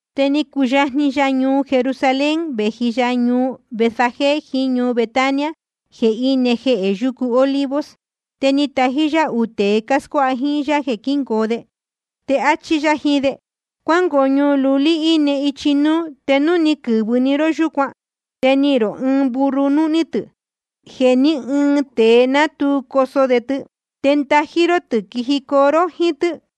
Te ni cuyajni ya ñuu Jerusalén, vēji ya ñuu Betfagé jiín ñuu Betania, jeē íne jehē yucu Olivos. Te ni tají yá uū tēe cáscuáha jíín yá jeē quíngoo de. Te áchí yá jiín de: Cuángoo ñuu lulí íne ichi núú. Te núu ni quɨ̄vɨ‑ni ró yúcuan, te nihīn rō ɨɨn burro núhní tɨ̄, jeē ní ɨɨn tēe ná tu coso de tɨ. Te ndají ró tɨ̄, quijicoo ró jíín tɨ́.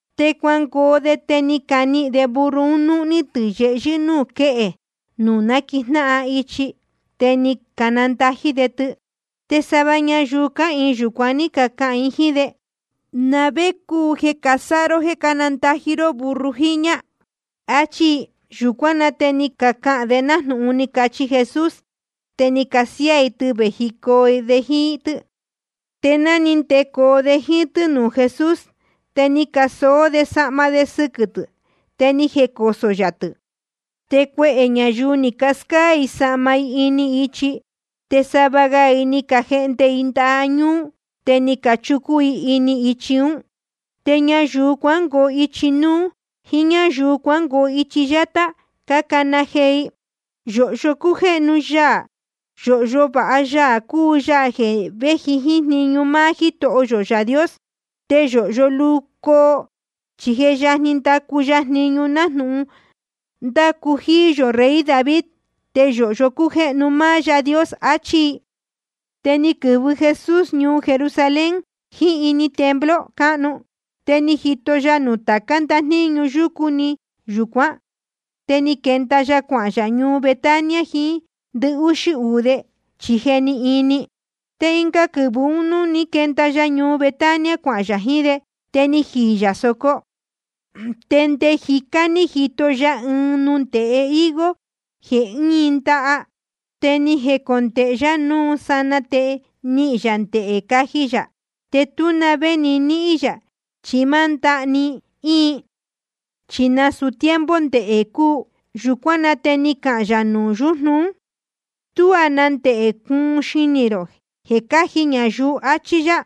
Te cuangoo de, te ni canihīn de burro un núhní tɨ̄ yehyɨ́ núū quéhe nuū náquijnáhan ichi. Te ni candají de tɨ. Te sava ñayuu cáhīin yūcuan ní cacahān jiín de: ¿Na vé cúu jeē casáha ró jeē cándají ró burro jiñā? achí i. Yūcuán na te ni cacahān de nájnūhun ni cachi Jesús. Te ni casiáá i tɨ vējicoo de jíín tɨ́. Te ni ndecoo de jíín tɨ́ nuū Jesús, te ni casoó de sahma de sɨquɨ̄ tɨ̄, te ni jecosō yā tɨ̄. Te cuehē ñayuu ni cascáá i sahma i ini ichi. Te sava ga i ni cajehnde i ndaha ñúú, te ni cachucun i ini ichi ún. Te ñayuu cuangoo ichi núú jíín ñáyuu cuangoo ichi yátá, cácana jee i: Yōhyo cújéhnu ya. Yōhyo vāha Yaā cúu Yaā jeē véji jíín jniñu máá Jítoho yō Yaā Dios. Te yōhyo luu coo, chi je yajni ndacu ya jniñu nájnūhun ni ndacu jíí yō rey David. Te yōhyo cújéhnu máá Yaā Dios. Achí i. Te ni quɨ̄vɨ Jesús ñuu Jerusalén, jíín ini templo cáhnu. Te ni jito ya nuū tācá ndajníñu yúcu nɨ́ɨ́ yúcuan. Te ni quenda ya cuahān yā ñuu Betania jiín ndɨhúxí uū de, chi je ni ini. Te ɨnga quɨvɨ̄ ún, nuū ní quenda ya ñuu Betania cuahān yā jiín de, te jíí yā sōco. Te nde jicá ni jito ya ɨɨn nundēhe higo jeē íin ndaha. Te ni jecondēhe yá núu sanaa te nihīn yā ndehē caji yā. Te tú na vé ni níhín yā, chi máá ndaha‑ni íin. Chi nasūu tiempo ndehē cúu. Yūcuán na te ni cahān yā nuū yujnu ún: Tuá na ndehē cuun cuɨtɨ xinī rō jeē cáji ñayuu, achí yá.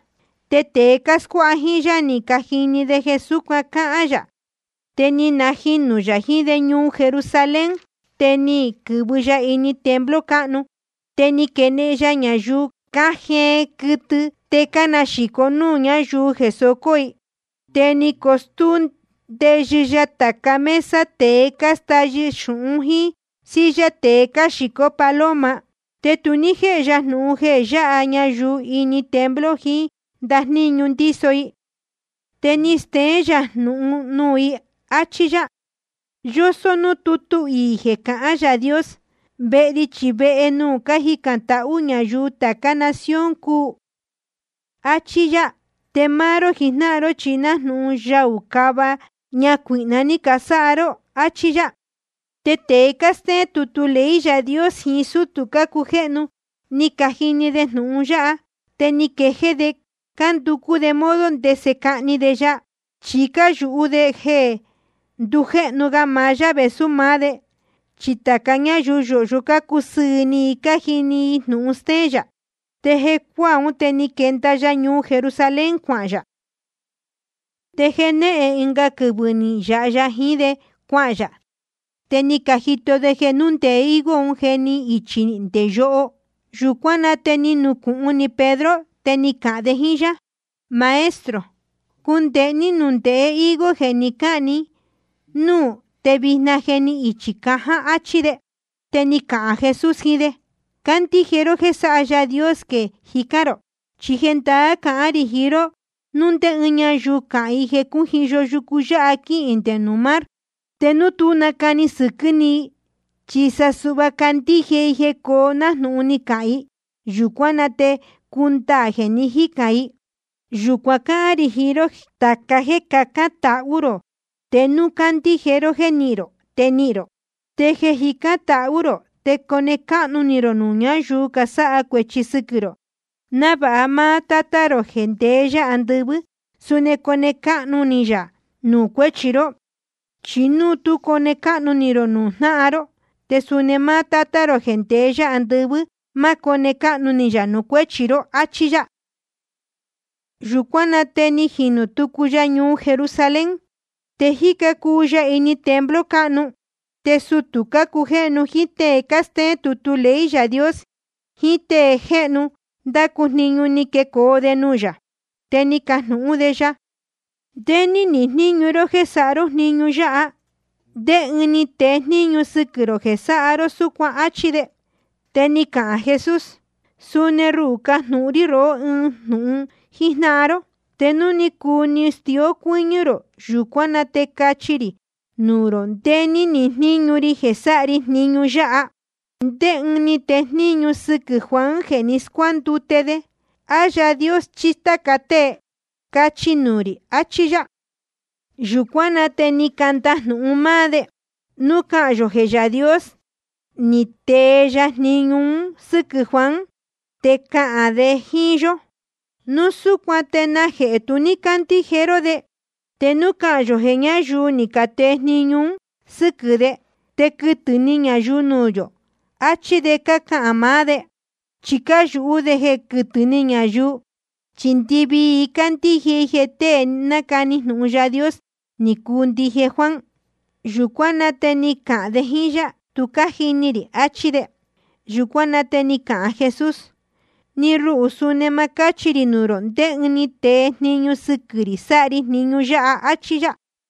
Te tēe cáscuáha jíín yá ni cajini de jeē súcuan ni cahān yā. Te ni najinū yā jiín de ñuu Jerusalén. Te ni quɨ̄vɨ ya ini templo cáhnu, te ni quenehen ya ñayuu cájeen quɨtɨ te cánaxīco núū ñáyuu jeē socō i. Te ni scotúú ndeyɨ ya tāca mesa tēe cástáyɨ xūhún, jíín silla tēe cáxīcó paloma. Te tu ní jéhe ya jnūhun jeē yáha ñayuu ini templo jiín ndajníñu ndíso i. Te ni steén yā jnūhun nuū i, áchí yá: Yósó núū tútu iī jeē cahán Yaā Dios: Vehe ri chi vehe nuū cájicān tahú ñayuu tācá nación cúu, áchí yá. Te máá ró jijnáhan ró chi nájnūhun yaū cava ñacuīhna ní canasáha ró, áchí yá. Te tēe cástéén tutu ley Yaā Dios jiín sútū cácujéhnu, ni cajini de jnūhun yáha, te ni quejéé de cánducú de modo ndese cahni de ya. Chi cáyūhú de jeē ndujéhnu ga maá yá vēsú maá de, chi tāca ñáyuu yōhyo cácusɨɨ̄ ni i cájini i jnūhun stéén yā. Te jeē cuácuaa, te ni quenda ya ñuu Jerusalén cuahān yā. Te jenéhen ɨnga quɨvɨ̄ ni nayāha ya jiín de cuahān yā. Te ni cajito de jeē núndēhe higo un je ni ichī nde yoho. Yūcuán na te ni nucūhun ni Pedro, te ni cahān de jíín yá: Maestro, cundēhe ní nundēhe higo jeē ni cáhān ni núū, te vijna je ni ichī caján, áchí de. Te ni cahān Jesús jiín de: Candíje ró jéē sáha Yaā Dios jeē jicán rō. Chi jendaá cahán rī jiín ró, núu ndé ñáyuu cahān i jeē cújiyo yucu yáha quihīn nde nuū mar, te núu tú nacani sɨquɨ́ ni i, chi sa suhva candíje i jeē cóo nájnūhun ni cahān i, yūcuán na te cundaā jeē ni jícān i. Jeē yúcuan cáhán rī jiín ró, tāca jéē cacán tahú rō, te núu candíje ró jéē nihín rō, te nihīn rō. Te jeē cájicān tahú rō, te cone cáhnu ni rō nuū ñáyuu casáha cuēchi sɨquɨ̄ rō, návāha máá Tátá rō jeē ndeé yá andɨvɨ́, suni cone cáhnu ni yā nuū cuéchi ró. Chi núu tú cone cáhnu ni rō nuū jnáhan ró, te suni máá Tátá rō jeē ndeé yá andɨvɨ́, ma cóne cáhnu ni yā nuū cuéchi ró, áchí yá. Yūcuán na te ni najinū tucu ya ñuu Jerusalén. Te jíca cuu ya ini templo cáhnu. Te sutū cácujéhnu jíín tée cástéén tutu ley Yaā Dios jiín tée jéhnu cándacu jniñu, ni quecoo de nuū yā. Te ni cacajnūhún de ya: ¿Ndé ní nihīn jníñu ró jéē sáha ró jniñu yáha? ¿Te ndé ɨɨn ni tee jniñu sɨquɨ̄ rō jeē sáha ró súcuan? áchí de. Te ni cahān Jesús: Suni ruhū, cajnūhun rí rohó ɨɨn jnūhun jíjnáhan ró. Te núu cuu stíó cuɨ́ñɨ́ rō, yūcuán na te cachi rī nuū rō ndé ní nihīn jníñu ri jeē sáha ri jniñu yáha. ¿Ndé ɨɨn ni tee jniñu sɨquɨ̄ Juan jeē ni scuándute de? ¿A Yaā Dios chí táca tée? Cachi nuū rī, achí yá. Yūcuán na te ni candajnūhun máá de: Núu cahān yō jeē Yaā Dios ni tee ya jniñu un sɨ́quɨ̄ Juan, te cahān de jíín yó: Núu súcuan ¿te najehē tu ní cácandíje ró de? Te núu cahān yō jeē ñáyuu ni catee jniñu un sɨ́quɨ̄ de, te quɨtɨ̄ ni ñayuu nuū yō, achí de cácahān maá de. Chi cáyūhú de jeē quɨtɨ̄ ni ñayuu, chi ndɨvii i cácandíje i jeē tée ni nacani jnūhun Yaā Dios ni cuu ndije Juan. Jeē yúcuan ní cacahān de jíín yá: Tu cájini rī, achí de. Yūcuán na te ni cahān Jesús: Ni ruhū, suni ma cáchi rī nuū rō ndé ɨɨn ni tee jniñu sɨquɨ̄ rī sáha ri jniñu yáha, áchí yá.